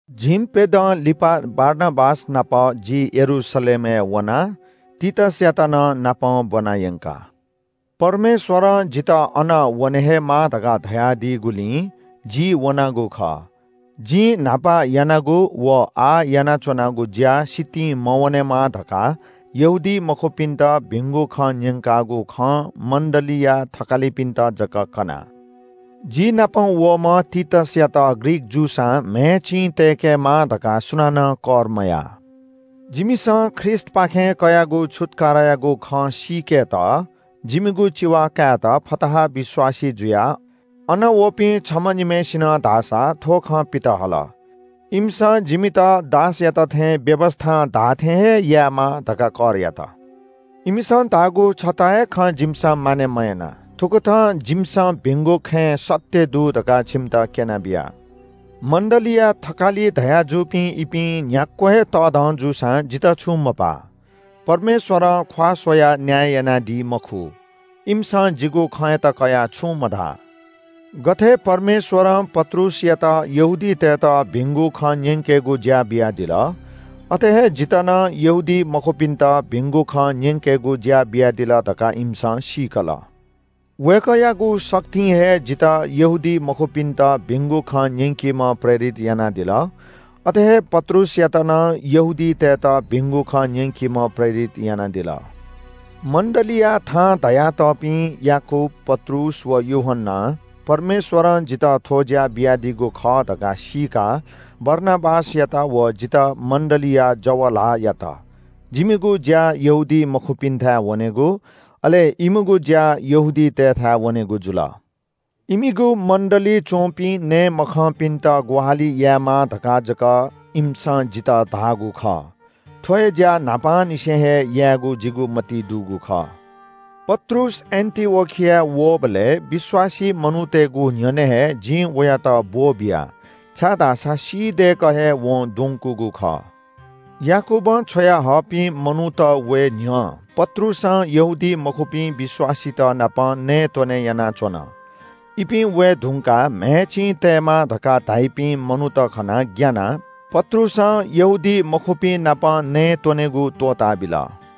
झिंप्‍यदँ लिपा बारनाबास नाप जि यरूशलेमय् वना। तीतसयात नं नापं ब्‍वना यंका। परमेश्‍वरं जितः अन वने हे माः धकाः धयादीगुलिं जि वनागु खः। जिं न्‍हापा यानागु व आः यानाच्‍वनागु ज्‍या सितिं मवनेमा धकाः यहूदीमखुपिन्‍त भिंगु खँ न्‍यंकागु खँ मण्‍डलीया थकालिपिन्‍त जक कना। जिनापं वःम्‍ह तीतसयात ग्रीक जूसां म्‍हय् चिं तय्‌केमाः धकाः सुनानं कर मया। जिमिसं ख्रीष्‍टपाखें कयागु छुत्‍कारायागु खँ सीकेत जिमिगु चिवा कायेत फताहा विश्‍वासी जुयाः अन वःपिं छम्‍ह निम्‍हय्‌सिनं धाःसा थ्‍व खँ पितहल। इमिसं जिमित दासयात थें व्‍यवस्‍थां धाःथें हे यायेमाः धकाः कर यात। इमिसं धाःगु छता हे खँ जिमिसं मानय् मयाना। थुकथं जिमिसं भिंगु खँय् सत्‍य दु धकाः छिमित क्‍यनाबिया। मण्‍डलीया थकालि धयाजूपिं इपिं न्‍ह्याक्‍व हे तःधं जूसां जितः छुं मपाः। परमेश्‍वरं ख्‍वाः स्‍वयाः न्‍याय यानादी मखु। इमिसं जिगु खँयात कयाः छुं मधाः। गथे परमेश्‍वरं पत्रुसयात यहूदीतय्‌त भिंगु खँ न्‍यंकेगु ज्‍या बियादिल, अथे हे जितः नं यहूदीमखुपिन्‍त भिंगु खँ न्‍यंकेगु ज्‍या बियादिल धकाः इमिसं सीकल। वय्‌कःयागु शक्तिं हे जितः यहूदीमखुपिन्‍त भिंगु खँ न्‍यंकीम्‍ह प्रेरित यानादिल। अथे हे पत्रुसयात नं यहूदीतय्‌त भिंगु खँ न्‍यंकीम्‍ह प्रेरित यानादिल। मण्‍डलीया थां धयातःपिं याकूब, पत्रुस व यूहन्‍नां परमेश्‍वरं जितः थ्‍व ज्‍या बियादीगु खः धकाः सीकाः बारनाबासयात व जितः मण्‍डलीया जव ल्‍हाः यात। जिमिगु ज्‍या यहूदीमखुपिन्‍थाय् वनेगु, अले इमिगु ज्‍या यहूदीतय्‌थाय् वनेगु जुल। इमिगु मण्‍डलीइ च्‍वंपिं नये मखंपिन्‍त ग्‍वाहालि यायेमाः धकाः जक इमिसं जितः धाःगु खः। थ्‍व हे ज्‍या न्‍हापांनिसें हे यायेगु जिगु मतिइ दुगु खः। पत्रुस एन्‍टिओखियाय् वःबलय् विश्‍वासी मनूतय्‌गु न्‍ह्यःने हे जिं वयात ब्‍वः बिया, छाय्‌धाःसा सी दय्‌कः हे वं द्वंकूगु खः। याकूबं छ्वयाहःपिं मनूत वये न्‍ह्यः पत्रुसं यहूदीमखुपिं विश्‍वासीतनाप नयेत्‍वनेगु यानाच्‍वन। इपिं वये धुंकाः म्‍हय् चिं तयेमाः धकाः धाइपिं मनूत खनाः ग्‍यानाः पत्रुसं यहूदीमखुपिं नाप नयेत्‍वनेगु त्‍वःताबिल।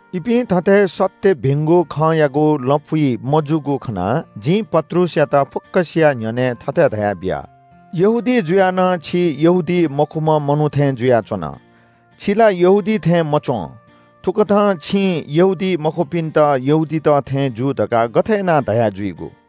इपिं थथे सत्‍य भिंगु खँयागु लँपुइ मजूगु खनाः जिं पत्रुसयात फुक्‍कसिया न्‍ह्यःने थथे धयाबिया – “यहूदी जुयाः नं छि यहूदीमखुम्‍ह मनू थें जुयाच्‍वन। छि ला यहूदी थें मच्‍वं। थुकथं छिं यहूदीमखुपिन्‍त यहूदीत थें जू धकाः गथे यानाः धया जुइगु?”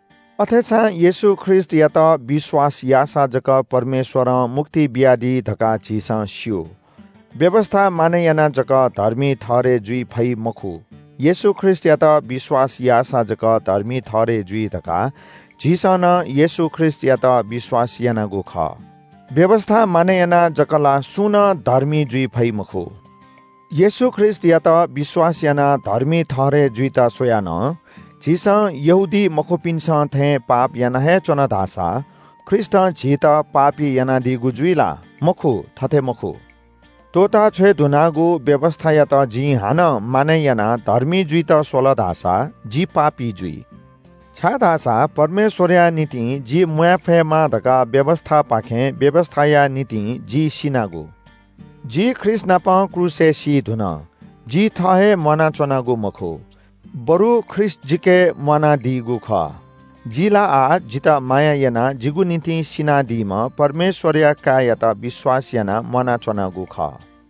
अथेसां येशू ख्रीष्‍टयात विश्‍वास याःसा जक परमेश्‍वरं मुक्ति बियादी धकाः झीसं स्‍यू। व्‍यवस्‍था मानय् यानाः जक धर्मी ठहरय् जुइ फइ मखु, येशू ख्रीष्‍टयात विश्‍वास याःसा जक धर्मी ठहरय् जुइ धकाः झीसं नं येशू ख्रीष्‍टयात विश्‍वास यानागु खः। व्‍यवस्‍था मानय् यानाः जक ला सुं नं धर्मी जुइ फइ मखु। येशू ख्रीष्‍टयात विश्‍वास यानाः धर्मी ठहरय् जुइत स्‍वयाः नं झीसं यहूदीमखुपिन्‍सं थें पाप याना हे च्‍वन धाःसा ख्रीष्‍टं झीत पापी यानादीगु जुइ ला? मखु, थथे मखु। त्‍वःताछ्वये धुनागु व्‍यवस्‍थायात जिं हानं मानय् यानाः धर्मी जुइत स्‍वल धाःसा जि पापी जुइ। छाय्‌धाःसा परमेश्‍वरया निंतिं जि म्‍वाये फयेमा धकाः व्‍यवस्‍थापाखें व्‍यवस्‍थाया निंतिं जि सिनागु। जि ख्रीष्‍टनाप क्रूसय् सी धुन, जि थः हे म्‍वानाच्‍वनागु मखु, बरु ख्रीष्‍ट जिके म्‍वानादीगु खः। जि ला आः जितः माया यानाः जिगु निंतिं सिनादीम्‍ह परमेश्‍वरया काय्‌यात विश्‍वास यानाः म्‍वानाच्‍वनागु खः।